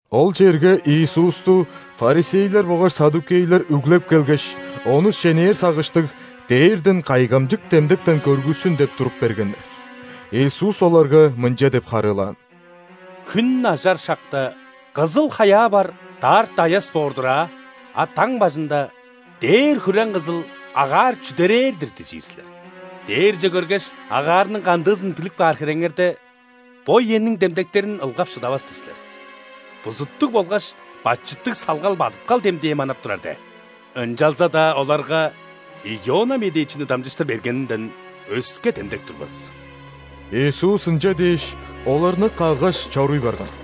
Ол черге Иисусту ·фарисейлер болгаш ·саддукейлер үглеп келгеш, Ону шенээр сагыштыг, дээрден кайгамчык демдектен көргүссүн деп туруп бергеннер. Иисус оларга мынча деп харыылаан: «Хүн ажар шакта: „Кызыл хаяа бар, даарта аяс боор-дур аа“, а даң бажында: „Дээр хүрең-кызыл, агаар чүдерээр-дир“ – дижир силер. Дээрже көргеш, агаарның кандыызын билип каар хиреңерде, бо үениң демдектерин ылгап шыдавас-тыр силер. Бузуттуг болгаш бачыттыг салгал бадыткал демдээ манап турар де. Ынчалза-даа оларга Иона медээчини дамчыштыр бергенинден өске демдек турбас». Иисус ынча дээш, оларны каггаш, чоруй барган.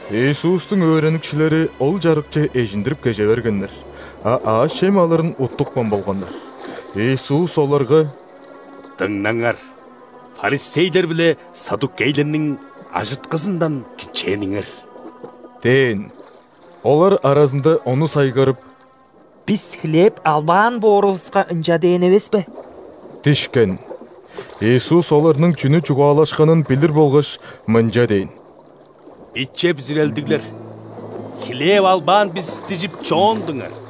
Иисустуң өөреникчилери ол чарыкче эжиндирип кеже бергеннер, а аъш-чем алырын уттупкан болганнар. Иисус оларга: «Дыңнаңар, ·фарисейлер биле ·саддукейлерниң ажыткызындан кичээниңер» – дээн. Олар аразында ону сайгарып: «Бис хлеб албаан боорувуска, ынча дээн эвеспе» – дишкен. Иисус оларның чүнү чугаалашканын билир болгаш, мынча дээн: «Биче бүзүрелдиглер, хлеб албаан бис дижип чоондуңар?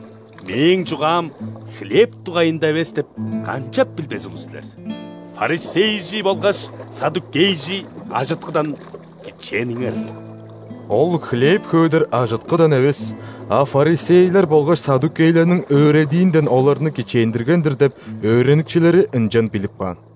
Мээң чугаам хлеб дугайында эвес деп канчап билбес улус силер? Фарисейжи болгаш саддукейжи ажыткыдан кичээниңер!» Ол хлеб хөөдер ажыткыдан эвес, а фарисейлер болгаш саддукейлерниң өөредиинден оларны кичээндирген-дир деп өөреникчилери ынчан билип каан.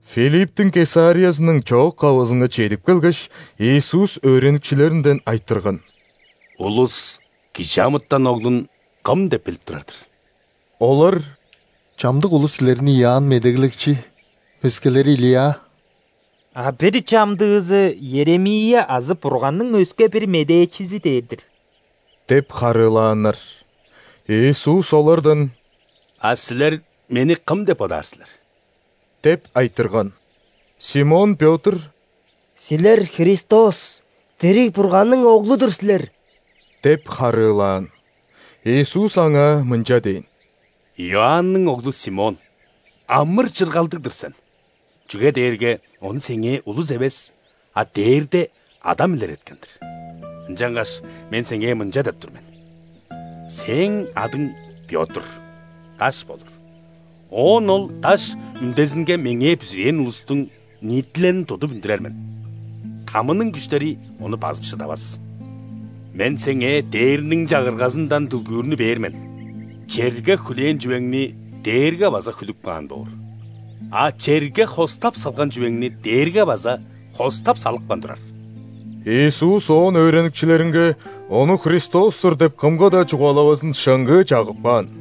Филипптиң Кесариязының чоок-кавызынга чедип келгеш, Иисус өөреникчилеринден айтырган: «Улус ·Кижи амытан Оглун кым деп билип турар-дыр?» Олар: «Чамдык улус Силерни Иоанн Медеглекчи, өскелери – Илия, а бир чамдыызы – Иеремия азы Бурганның өске-бир медээчизи дээр-дир» – деп харыылааннар. Иисус олардан: «А силер Мени кым деп бодаар силер?» – деп айтырган. Симон Пётр: «Силер – Христос, дириг Бурганның Оглу-дур силер» – деп харыылаан. Иисус аңаа мынча дээн: «Иоанның оглу Симон, амыр-чыргалдыг-дыр сен, чүге дээрге ону сеңээ улус эвес, а Дээрде Адам илереткен-дир. Ынчангаш Мен сеңээ мынча деп тур мен: сээң адың – Пётр, даш болур. Оон ол даш үндезинге Меңээ бүзүрээн улустуң ниитилелин тудуп үндүрер мен, ·тамының күштери ону базып шыдавас. Мен сеңээ Дээрниң Чагыргазындан дүлгүүрнү бээр мен, черге хүлээн чүвеңни дээрге база хүлүп каан боор, а черге хостап салган чүвеңни дээрге база хостап салыпкан турар». Иисус оон өөреникчилеринге Ону Христос-тур деп кымга-даа чугаалавазын шыңгыы чагып каан.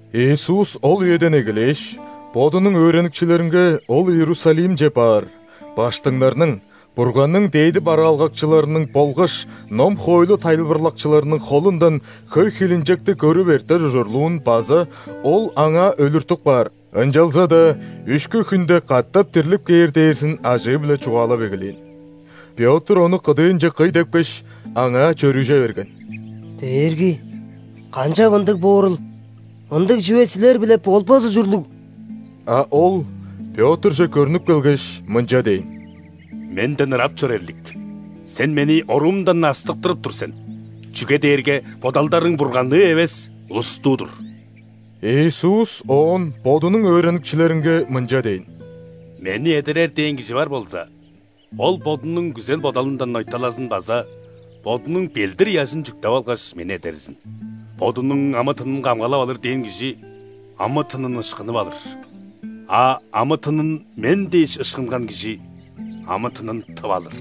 Иисус ол үеден эгелээш, Бодунуң өөреникчилеринге Ол Иерусалимче баар, ·баштыңнарның, Бурганның дээди бараалгакчыларының болгаш ном-хоойлу тайылбырлакчыларының холундан хөй хилинчекти көрүп эртер ужурлуун база Ол аңаа өлүртүп каар, ынчалза-даа үшкү хүнде катап дирлип кээр дээрзин ажыы-биле чугаалап эгелээн. Пётр Ону кыдыынче кый депкеш, Аңаа чөрүже берген: «Дээрги! Канчап ындыг боорул! Ындыг чүве Силер-биле болбас ужурлуг!» А Ол Пётрже көрнүп келгеш, мынча дээн: «Менден ырап чор, эрлик! Сен Мени оруумдан астыктырып тур сен, чүге дээрге бодалдарың Бурганныы эвес, улустуу-дур». Иисус оон Бодунуң өөреникчилеринге мынча дээн: «Мени эдерер дээн кижи бар болза, ол бодунуң күзел-бодалындан ойталазын база бодунуң ·белдир-ыяжын чүктеп алгаш, Мени эдерзин. Бодунуң амы-тынын камгалап алыр дээн кижи амы-тынын ышкынып алыр, а амы-тынын Мен дээш ышкынган кижи амы-тынын тып алыр.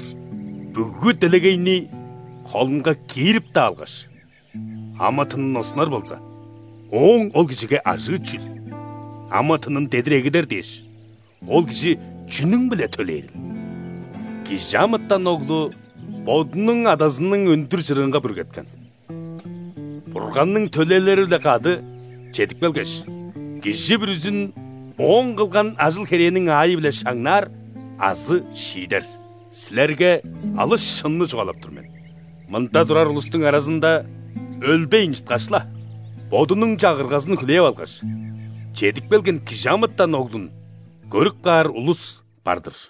Бүгү делегейни холунга киирип-даа алгаш, амы-тынын оскунар болза, ооң ол кижиге ажыы чүл? Амы-тынын дедир эгидер дээш, ол кижи чүнүң-биле төлээрил? ·Кижи амытан Оглу Бодунуң Адазының өндүр чырыынга бүргеткен, Бурганның төлээлери-биле кады чедип келгеш, кижи бүрүзүн ооң кылган ажыл-херээниң аайы-биле шаңнаар азы шиидер. Силерге алыс шынны чугаалап тур мен: мында турар улустуң аразында, өлбейн чыткаш-ла, Бодунуң Чагыргазын хүлээп алгаш чедип келген Кижи амытан Оглун көрүп каар улус бар-дыр».